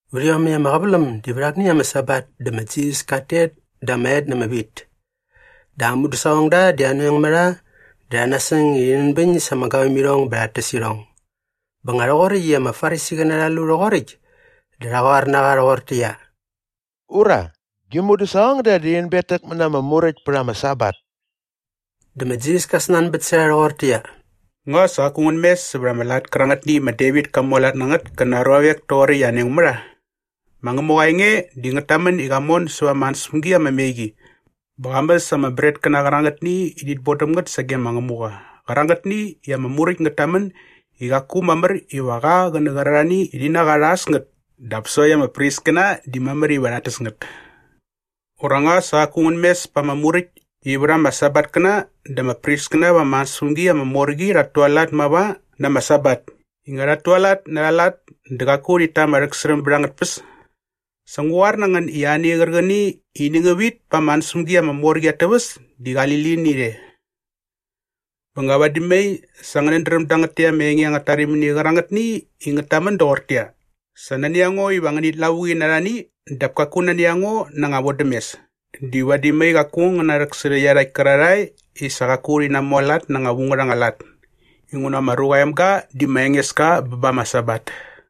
Vät iomäkt ama qäväläm di vät akni ama Sabat dä ma Jisas kat tet da ama et na ama wit. Dä aa mudäsaqongda di anoeng mä rha dä rha nasäng i rhi nänbäñ sa ama gavämirhong bä rhat täs irhong. Bä nga rhoqoräkt i ama Farisiqäna rha lu rhoqoräkt dä rha qoar na qa rhoqortäqyia, “Ura, gi mudäsaqongda di rhi nänbetäkmät na ama Muräkt pät ama Sabat.” Dä ma Jisas ka snanbät sä rha rhoqortäqyia, “Nga sa qaku ngän mes sävät ama lat kärangätni i ma Devit ka mualat na ngät kä na aa ruavek toqoräkt i anoeng mä rha? Ma Ngämuqa aa enge di ngät tamän i qa mon sävä ama ansäspämgi ama me qi bä qa mäs ama bretkäna qärangätni i rhit bodäm ngät sage ma Ngämuqa qärangätni i ama Muräkt ngät tamän i qaku mamär iva qa qä nä qärarhani i rhi na qa rha äs ngät dap sokt ama priskäna di mamär iva rhat täs ngät. Ura nga sa qaku ngän mes pa ama Muräkt i vät ama Sabatkäna dä ama priskäna va ama ansäspämgi ama mor qi rhat tualat mava na ama Sabat i nga rhat tualat na arha lat dä qaku rhit ta ama rhäksärhäm bät angät tpäs? Sa ngu qoar na ngän i ani qärqäni i ini ngä vit pa ama ansäspämgi ama mor qi at täväs di qali lini rhe. Bä nga vadi mai sa ngänät dräm dangät täkt ama enge angät tarimini qärangätni i ngät tamän doqortäqyia, ‘Sa nani a ngo iva ngänit lavuqi na arhani dap kaku nani a ngo na anga vodämes’ di vadi mai qaku ngän narhäksärhä iarhakt kärarhae i sa qaku rhi namualat na anga vu ngät anga lat. Inguna ma Ruqa aa Emga di ma Engeska bä ba ama Sabat.”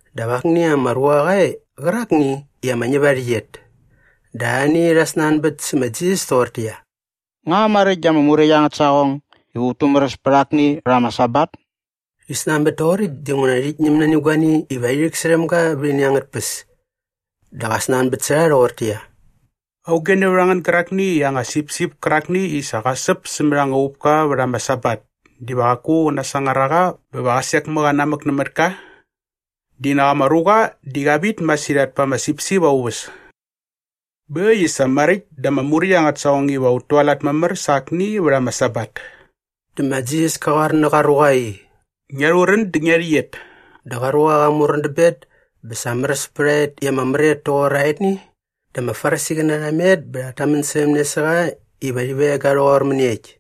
Dap akni ama ruqa qa e qärakni i ama ñäp aa rhäqyet. Dä arhani rha snanbät sä ma Jisas toqortäqyia, “Nga maräkt da ama Muräkt angät saqong iva ut tumäräs pät akni vät ama Sabat?” Rhi snanbät toqoräkt dinguna rhit ñäm nani guani iva rhi rhäksärhäm ga vät ini angät tpäs. Dä qa snanbät sä rha rhoqortäqyia, “Auge nävät a ngän gärakni i aa anga sipsip kärakni i sa qa säp sämät ama uqupka vät ama Sabat diva qaku qä nasangar a qa bä va qä sek mä qa nämät ka? Di nak ama ruqa di qa vit masirhat pa ama sipsip aa uväs! Bä äkt i sa maräkt da ama Muräkt angät saqong iva ut tualat mamär sa akni vät ama Sabat.” Dä ma Jisas ka qoar nä qa ruqa i, “Ngia rhurän dä ngia rhäqyet.” Dä qa ruqa qa murän dä bet bä sa märäs pät a et i ama mär et toqor aetni. Dä ama Farisiqäna rha met bä rhat tamän särhäm ne sä qa iva rhi veng ga rhoqor mäniekt.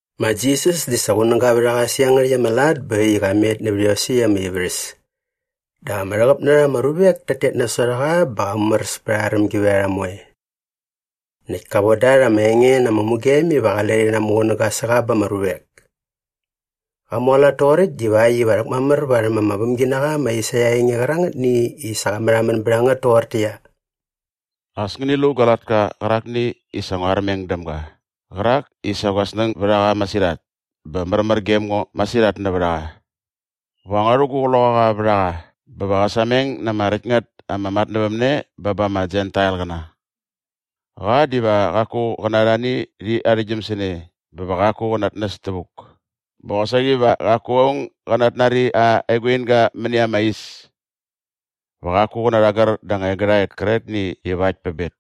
Ma Jisas di sa qunäga vät a qa sä iangärhäkt ama lat bä äkt i qa met nävät iosäkt ama ivärhäs. Dä ama rhäqäp na rha ama ruvek tat tet nasot a qa bä qa mumäräs pät arha rämgivärharha moe. Näkt ka von da rha ama enge na ama mugem iva qale rhi namuqunäga sä qa ba ama ruvek. Qa mualat toqoräkt divakt iva rhäkmamär varhäm ama vämginaqa ma Aisaia aa enge qärangätni i sa qa märhamän bät a ngät toqortäqyia, “As ngäni lu gua latka qärakni i sa ngua armeng däm ga qärak i sa gua snäng bät a qa masirhat bä märmär gem ngo masirhat nävät a qa. Va ngua rhu gu Qloqaqa vät a qa bä va qä sameng na ama räkt ngät ama matnävämne bä ba ama Jentailqäna. Qa diva qaku qä na arhani rhi narhäktgyäm sä ne bä va qaku qä natnäs tävuk bä qosaqi va qaku aung gä natnari aa eguinga mäni ama is. Va qaku qä narhagär da anga egärhaet kärqetni ivakt pä bet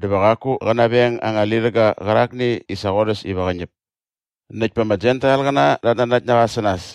dä va qaku qä naveng anga lirhäga qärakni i sa qorhäs iva qä ñäp. Näkt pa ama Jentailqäna rhat nanakt na qa sä nas.”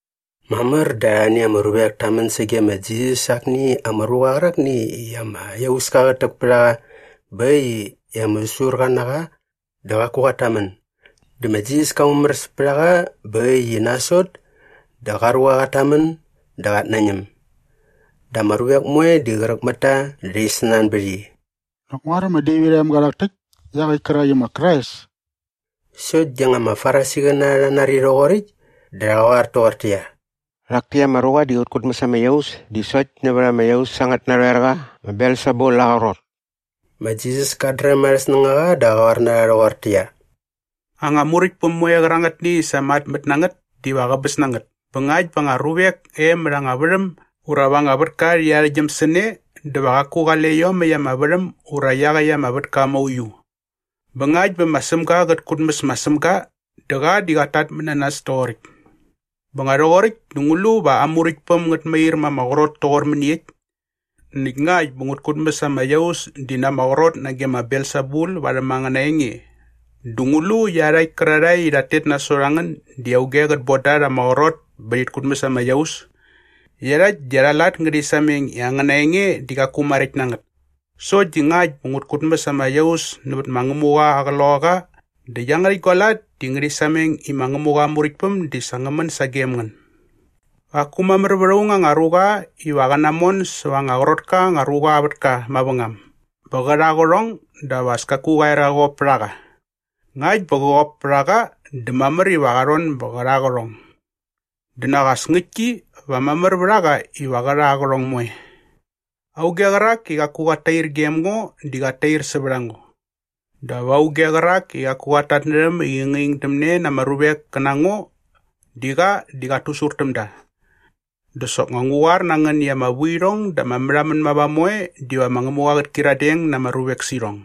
Mamär dä arhani ama ruvek ta män sage ma Jisas sä akni ama ruqa qärakni i ama iauska qät täk pät a qa bä äkt i ama säsurqa na qa dä qaku qat tamän. Dä ma Jisas ka mumäräs pät a qa bä äkt i nasot dä qa ruqa qat tamän dä qat nañäm. Dä ama ruvek moe di qräk mät ta dä rhi snanbät i, “Nak nguaräm ma Devit aa emga rhak täkt iaqäkt kärak i ma Krais?” Sokt di nga ama Farisiqäna rha nari rhoqoräkt dä rha qoar toqortäqyia, “Rhak täkt ama ruqa di qät kutmäs ama iaus di sokt nävät ama iaus angät narhoerqa ma Belsebul aa qrot.” Ma Jisas kat dräm arhä snängaqa dä qa qoar na rha rhoqortäqyia, “Anga muräktpäm moe qärangätni i sa matmät na ngät diva qäbäs na ngät bä ngakt bä anga ruvek e mät anga värhäm ura va anga vätka rhi arhäktgyäm sä ne dä va qaku qale iomäkt ama värhäm ura iaqäkt ama vätka mauiu. Bä ngakt bä ma Sämga qät kutmäs ma Sämga dä qa di qat tatmät na nas toqoräkt. Bä nga rhoqoräkt dä ngu lu va aa muräktpäm ngät mair ma ama qrot toqor mäniekt? Näkt ngakt bä ngut kutmäs ama iaus di na ama qrot nage ma Belsebul varhäm angäna enge dä ngu lu iarhakt kärarhae i rhat tet nasot a ngän di auge qät boda rha ama qrot bä rhit kutmäs ama iaus? Iarhakt di arha lat ngärhi sameng i angäna enge di qaku maräkt na ngät. Sokt di ngakt bä ngut kutmäs ama iaus nävät ma Ngämuqa aa Qloqaqa dä iangärhäkt gua lat di ngärhi sameng i ma Ngämuqa aa Muräktpäm di sa ngä män sagem ngän. Qaku mamär vät aung anga ruqa iva qä namon säva anga qrot ka anga ruqa aa vätka mavängam bä qä rha aa qärhong dap as kaku qa er qa qop pät a qa. Ngakt bä qä qop pät a qa dä mamär iva qa rhon bä qä rha aa qärhong. Dä nak as ngäktki va mamär vät a qa iva qä rha aa qärhong moe. “Auge qärak i qaku qat tair gem ngo di qat tair sävät a ngo. Dap auge qärak i qaku qat tatnärhäm i qä ngingdämne na ama ruvek kä na ngo di qa di qat tusur täm da. Dä soknga ngu qoar na ngän i ama vuirhong dä ama märhamän mava moe diva ma Ngämuqa qät kyiradeng na ama ruvek sä irhong.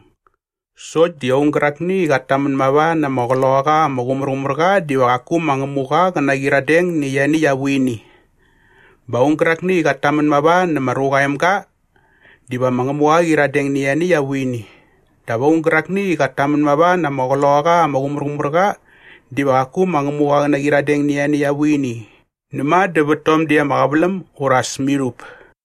Sokt di aung gärakni i qat tamän mava nä ama Qloqaqa ama Qumärqumärqa diva qaku ma Ngämuqa qä naqyiradeng nä ianiäkt aa vuini. Bä aung gärakni i qat tamän mava nä ma Ruqa aa Emga diva ma Ngämuqa qä qyiradeng nä ianiäkt aa vuini. Dap aung gärakni i qat tamän mava na ama Qloqaqa ama Qumärqumärqa diva qaku ma Ngämuqa qä naqyiradeng nä ianiäkt aa vuini näma dä vät tom däkt ama qäväläm ura as mirhup.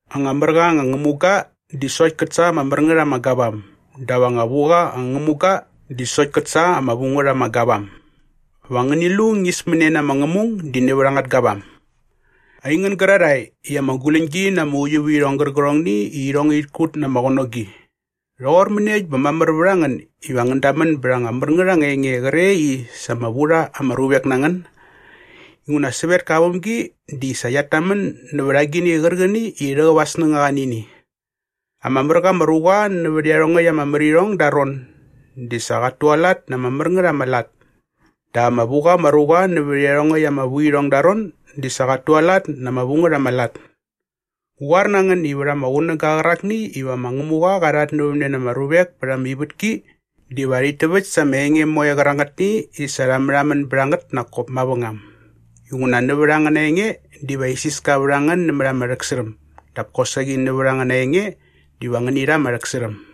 “Anga mär qa anga ngämuga di sokt kät sa ama mär ngät ama gavam dap anga vu qa anga ngämuga di sokt kät sa ama vu ngät ama gavam. Va ngäni lu ñismäne na ama ngämung di nävät angät gavam. Aingän gärarhae i ama guläñgi na ama uiuvärhirhong gärqärhongni i irhong ngärhit kut na ama qänogi, rhoqor mäniekt bä mamär vät a ngän iva ngän damän bät anga mär ngät anga enge qre i sa ama vu rha ama ruvek na ngän? Inguna sävetka aa vämgi di sa qiat tamän nävät agini qärqäni i rhäqäp aa snängaqa nä ini. Ama mär qa ama ruqa nävät iarhongäkt ama märirhong da aa ron di sa qat tualat na ama mär ngät ama lat dap ama vu qa ama ruqa nävät iarhongäkt ama vuirhong da aa ron di sa qat tualat na ama vu ngät ama lat. Ngu qoar na ngän i vät ama qunäga qärakni iva ma Ngämuqa qa rhatnävämne na ama ruvek pät ama ivätki diva rhit täväkt sa ama enge moe qärangätni i sa rha märhamän bät a ngät nak kop mavängam inguna nävät angäna enge diva isiska vät a ngän nämät ama rhäksärhäm dap kosaqi nävät angäna enge diva ngäni rha ama rhäksärhäm.”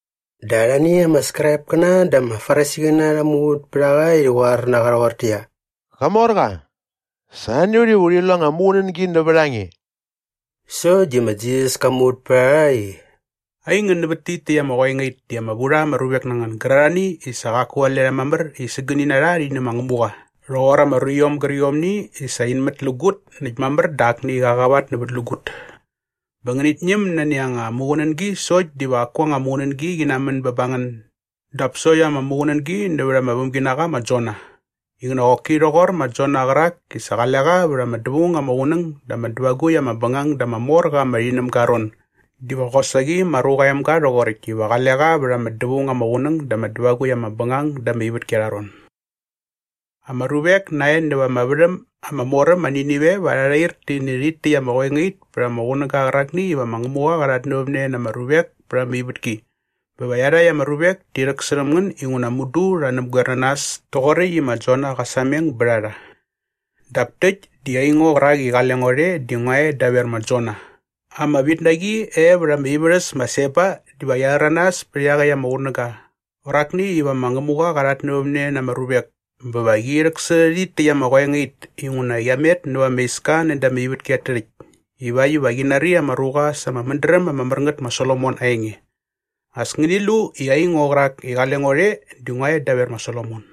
Dä arhani ama Skraipkäna dä ama Farisiqäna rha muvät pät a qa i rhi qoar na qa rhoqortäqyia, “Qamorqa, sa nani a ut iva urhi lu anga muqunängi nävät a nge.” Sokt di ma Jisas ka muvät pät a rha i, “Aingän nävät tit täkt ama qoengait di ama vu rha ama ruvek na ngän gärarhani i sa qaku qale rha mamär i sägäni na rha rhi nä ma Ngämuqa rhoqor ama ruiom gärqiomni i sa in mätlägut näkt mamär dä akni qa qavatnävätlägut. Bä ngänit ñäm nani anga muqunängi sokt diva qaku anga muqunängi qi namän bä ba ngän dap sokt ama muqunängi nävät ama vämginaqa ma Jona. Inguna qoki rhoqor ma Jona qärak i sa qale qa vät ama dävaung ama qunäng dä ama dävagukt ama bängang da ama mor qa ama rhinämga aa ron diva qosaqi ma Ruqa aa Emga rhoqoräkt iva qale qa vät ama dävaung ama qunäng dä ama dävagukt ama bängang da ama ivätki aa ron. Ama ruvek nae näva ama värhäm ama mor äm ma Ninive va rha rhair ti nä rhit täkt ama qoengait pät ama qunäga qärakni iva ma Ngämuqa qa rhatnävämne na ama ruvek pät ama ivätki bä va iarhakt ama ruvek ti rhäksärhäm ngän inguna mudu rha näpgoer na nas toqoräkt i ma Jona qa sameng bät a rha. Dap täkt di aingo qärak i qale ngo rhe di ngua e daver ma Jona.” Ama vitnaqi e vät ama ivärhäs ma Seba diva qia rhäranas pät iaqäkt ama qunäga qärakni iva ma Ngämuqa qa rhatnävämne na ama ruvek bä va qi rhäksärhä rhit täkt ama qoengait inguna qia met näva ama iska näda ama ivätki at tärhäkt ivakt iva qi nari ama ruqa sa ama mädräm ama mär ngät ma Solomon aa enge. As ngäni lu i aingo qärak i qale ngo rhe di ngua e daver ma Solomon.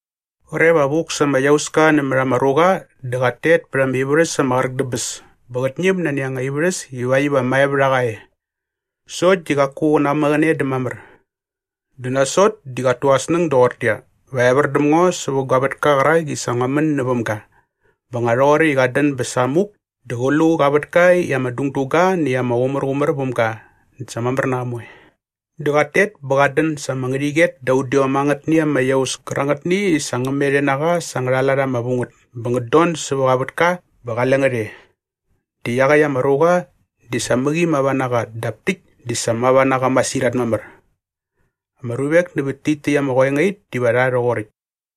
“Qre va vuk sa ama iauska nämät ama ruqa dä qat tet pät ama ivärhäs ama qräk dä bäs bä qät ñäm nani anga ivärhäs ivakt iva mae vät a qa e. Sokt di qaku qä namäqäne dä mamär. Dä nasot di qat tu aa snäng doqortäqyia, ‘Va evär däm ngo sävä gua vätka qärak i sa ngua män näväm ga.’ Bä nga rhoqoräkt i qat dän bä samuk dä qä lu qa vätka i ama dungdu ga näkt ama qumärqumär väm ga näkt sa mamär na qa moe. Dä qat tet bä qat dän sa ama ngärhäqyet da udiom angätni ama iaus kärangätni i sa ngä met e na qa sa angärha lat ama vu ngät bä ngät don sävä qa vätka bä qale ngät e. Dä iaqäkt ama ruqa di sa mäqi mava na qa dap täkt di sa mava na qa masirhat mamär. Ama ruvek nävät tit täkt ama qoengait diva rha rhoqoräkt.”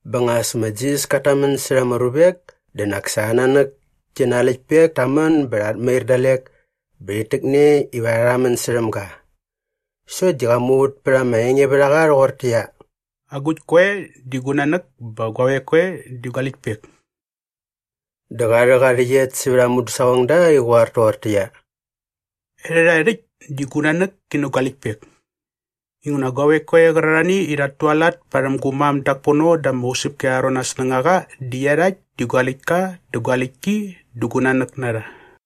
Bä nga as ma Jisas kat tamän särha ama ruvek dä nak sa aa nanäk ki na aa läktpek ta män bä rhat mair dalek bä rhit täkne iva rha rhamän särhäm ga. Sokt di qa muvät pät ama engevärhaqa rhoqortäqyia, “Agukt koe di gu nanäk bä guavek koe di gua läktpek?” Dä qa rhäk aa rhäqyet sävät aa mudäsaqongda i qä qoar toqortäqyia, “Erhärhae rhäkt, di gu nanäk ki nä gua läktpek! Inguna guavek koe qärarhani i rhat tualat parhäm gu mam dak pono da ama usäpki arha ron aa snängaqa di iarhakt di gua läktka dä gua läktki dä gu nanäk na rha.”